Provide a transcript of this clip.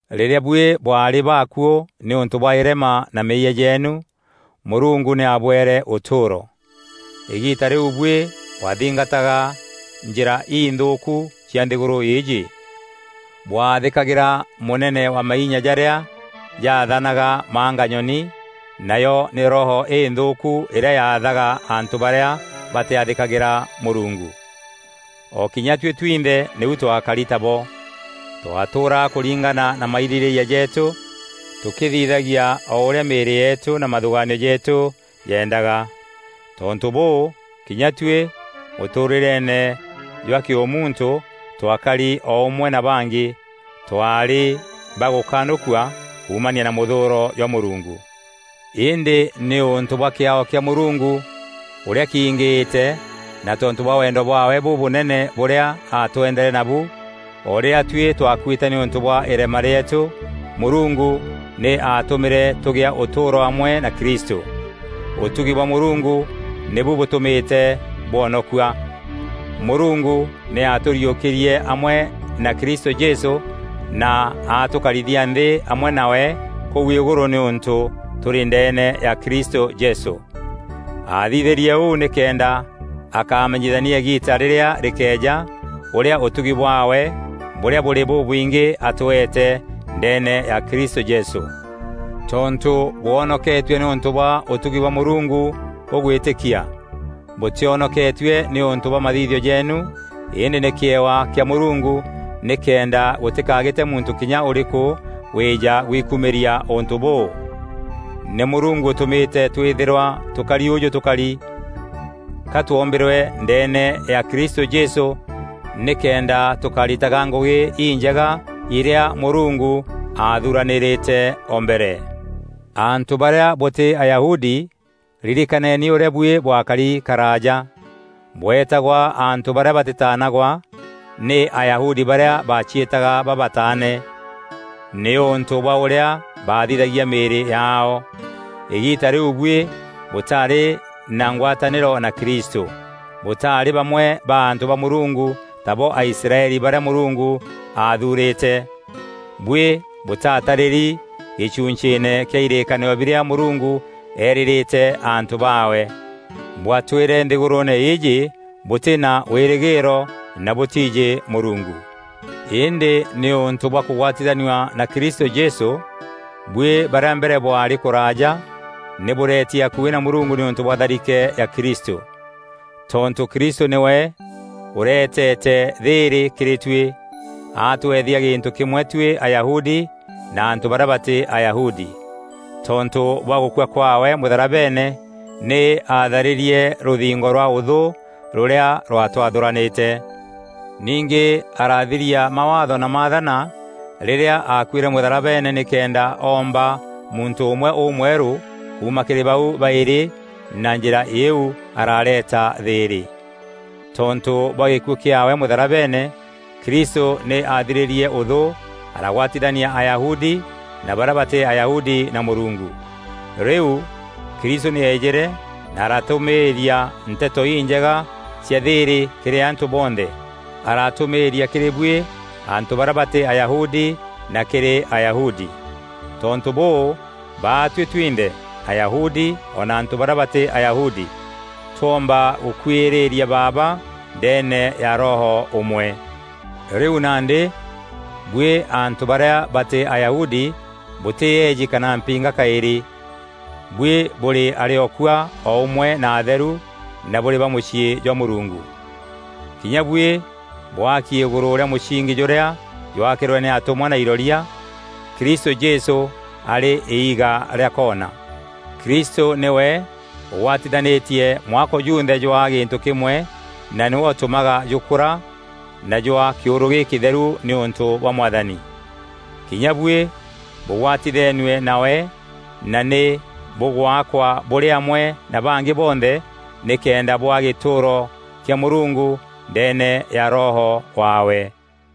Rîrîa buî bwaarî baakuû nîûntû bwa îrema na meeyia jeenu, Mûrungu nî aabwere ûtûûro. Îgiita rîu buî bwathingataga njîra inthûûku cia nthîgûrû îîjî. Bwaathîkagîra mûnene wa mainya jarîa jathanaga manganyoni, nayo nî roho îthûûku îrîa yathaga antû barîa batîathîkagîra Mûrungu. O kinya tuî twinthe nîu twakari tabo, twatûûraga kûringana na mairîrîîria jeetû, tûkîthithagia o ûrîa mîîrî yeetû na mathûgaanio jeetû jeendaga. Tontû bûû, kinya tuî mûtûûrîreene jwa kîûmuntû twakari o ûmwe na bangî; twaarî ba gûkanûkua kuumania na mûthûûro jwa Mûrungu. Îndî nîûntû bwa kîaao kîa Mûrungu ûrîa kingîîte na tontû bwa wendo bwaawe bûbûnene bûrîa aatwendere nabu, o rîrîa tuî twakuîte nîûntû bwa îrema rîeetû, Mûrungu nî aatûmîre tûgîa ûtûûro amwe na Kristû. Ûtugi bwa Mûrungu nîbu bûtûmîte bwonokua. Mûrungu nî aatûriûkîrie amwe na Kristû Jesû na atûkarithia nthî amwe nawe kûu îgûrû nîûntû tûrî ndeene ya Kristû Jesû. Aathithîrie ûu nîkenda akamenyithania îgiita rîrîa rîkeeja, ûrîa ûtugi bwaawe bûrîa bûrî bûbwingî atweete ndeene ya Kristû Jesû. Tontû bwonoketue nîûntû bwa ûtugi bwa Mûrungu bûgwîtîkia. Bûtîonoketue nîûntû bwa mathithio jeenu îndî nî kîewa kîa Mûrungu, nîkenda gûtîkagîte muntû kinya ûrîkû wîîja gwikumîria ûntû bûû. Nî Mûrungu ûtûmîte twîthîrwa tûkari ûjû tûkari, ka twombîrwe ndeene ya Kristû Jesû nîkenda tûkaritaga ngûgî injega irîa Mûrungu aathuranîrîte o mbere. Antû barîa bûtî Ayahudi, ririkaneni ûrîa buî bwakari karaaja. Bweetagwa antû barîa batîtaanagwa nî Ayahudi barîa baciîtaga “babataane” nîûntû bwa ûrîa bathithagia mîîrî yaao. Îgiita rîu buî bûtarî na ngwatanîro na Kristû; bûtaarî bamwe ba antû ba Mûrungu tabo Aisraeli barîa Mûrungu aathuurîte. Buî bûtatarîri gîchunchîîne kîa îrîîkanîro birîa Mûrungu eerîîrîte antû baawe. Bwatwîre nthîgûrûûne îîjî bûtî na wîrîgîîro na bûtiijî Mûrungu. Îndî nîûntû bwa kûgwatithanua na Kristû Jesû, bwî barîa mbere bwaarî kûraaja nî bûreeti akuî na Mûrungu nîûntû bwa tharike ya Kristû. Tontû Kristû nîwe ûreetete thîîrî kîrî tuî, atweethia gîntû kîmwe tuî Ayahudi na antû barîa batî Ayahudi. Tontû bwa gûkua kwaawe mûtharabeene, nî aatharîrie rûthingo rwa ûthû rûrîa rwatwathûranîte. Ningî aarathiria mawaatho na maathana rîrîa aakuîre mûtharabeene nîkenda oomba muntû ûmwe ûmwerû kuuma kîrî bau baîrî, na njîra îîu aarareeta thîîrî. Tontû bwa gîkuû kîaawe mûtharabeene, Kristû nî aathirîrîe ûthû aragwatithania Ayahudi na barîa batî Ayahudi na Mûrungu. Rîu, Kristû nî eejîre na aratûmîîria Nteto Injega cia thîîrî kîrî antû bonthe; aratûmîîria kîrî buî antû barîa batî Ayahudi na kîrî Ayahudi. Tontû bûû, baatuî twinthe, Ayahudi o na antû barîa batî Ayahudi, twoomba gûkwîîrîria Baaba ndeene ya Roho ûmwe. Rîu nandî, buî antû barîa batî Ayahudi bûtî eeji kana mpinga kaîrî. Buî bûrî arîokua o ûmwe na atheru, na bûrî ba mûciî jwa Mûrungu. Kinya buî bwaaki îgûrû rîa mûsingi jûrîa jwakîrwe nî atûmwa na iroria, Kristû Jesû arî iiga rîa koona. Kristû nîwe ûgwatithanîtie mwako junthe jwaa gîntû kîmwe na nîwe ûtûmaga jûkûra na jwaa kîûrû gîkîtheru nîûntû bwa Mwathani. Kinya buî bûgwatithenue nawe na nî bûgwakwa bûrî amwe na bangî bonthe nîkenda bûaa gîtûûro kîa Mûrungu ndeene ya Roho waawe.